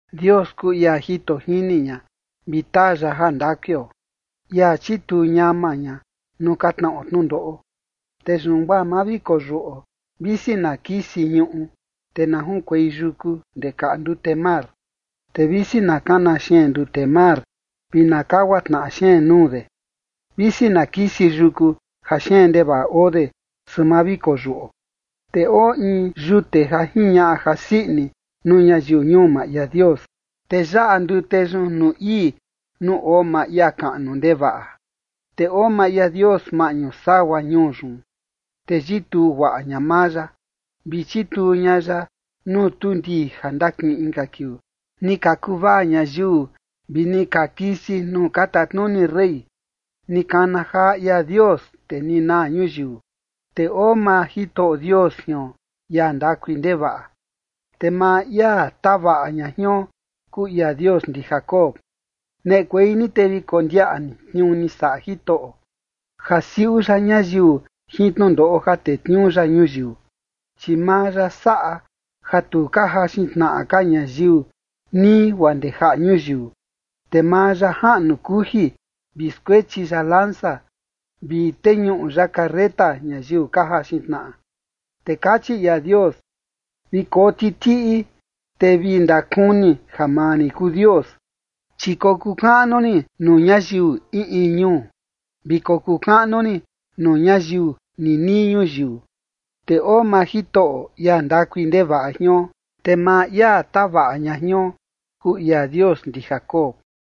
Dios kuu ia jito jini ña, vi taa ya jandakuio, ia chituu ñama ña nuu ka tnaꞌo tnundoꞌo. Te yun guaa ma vi koyuꞌo, visi na kisi ñuꞌu, te na junkuei yuku ndee kaꞌa ndute mar. Te visi na kana xeen ndute mar vi na kagua tnaꞌa xeen nuu de, visi na kisi yuku ja xeen ndevaꞌa oo de, su ma vi koyuꞌo. Te oo in yute ja jiñaꞌa jasii ini nuu ñayiu ñuu maa ia Dios, te yaꞌa ndute yun nuu ii, nuu oo maa ia kaꞌnu ndevaꞌa. Te oo maa ia Dios maꞌñu sagua ñuu yun, te yituu guaꞌa ña maa ya, vi chituu ña ya nuu tuu ndii ja ndakiꞌin inka kiuu. Ni ka kuvaa ñayiu, vi ni ka kisi nuu ka tatnuni rey; ni kana jaa ia Dios, te ni naa ñuyiu. Te oo maa Jitoꞌo Dios jion, ia ndakui ndevaꞌa, te maa ia tavaꞌa ña jion kuu ia Dios ndi Jacob. Neꞌekuei ni te vi kondiaꞌa ni tniuu ni saꞌa Jitoꞌo, ja siuꞌu ya ñayiu jin tnundoꞌo ja tetniuu ya ñuyiu. Chi maa ya saꞌa ja tu ka jaxin tnaꞌa ka ñayiu nii guaa ndee jaꞌa ñuyiu. Te maa ya jaꞌnu kuji vi skuechi ya lanza, vi teñuꞌu ya carreta ñayiu ka jaxin tnaꞌa. Te kachi ia Dios: “Vi koo titiꞌi, te vi ndakuni ja maa rin kuu Dios, chi kokuu kaꞌnu rin nuu ñayiu in in ñuu, vi kokuu kaꞌnu rin nuu ñayiu ninii ñuyiu”. Te oo maa Jitoꞌo, ia ndakui ndevaꞌa jion, te maa ia tavaꞌa ña jion kuu ia Dios ndi Jacob.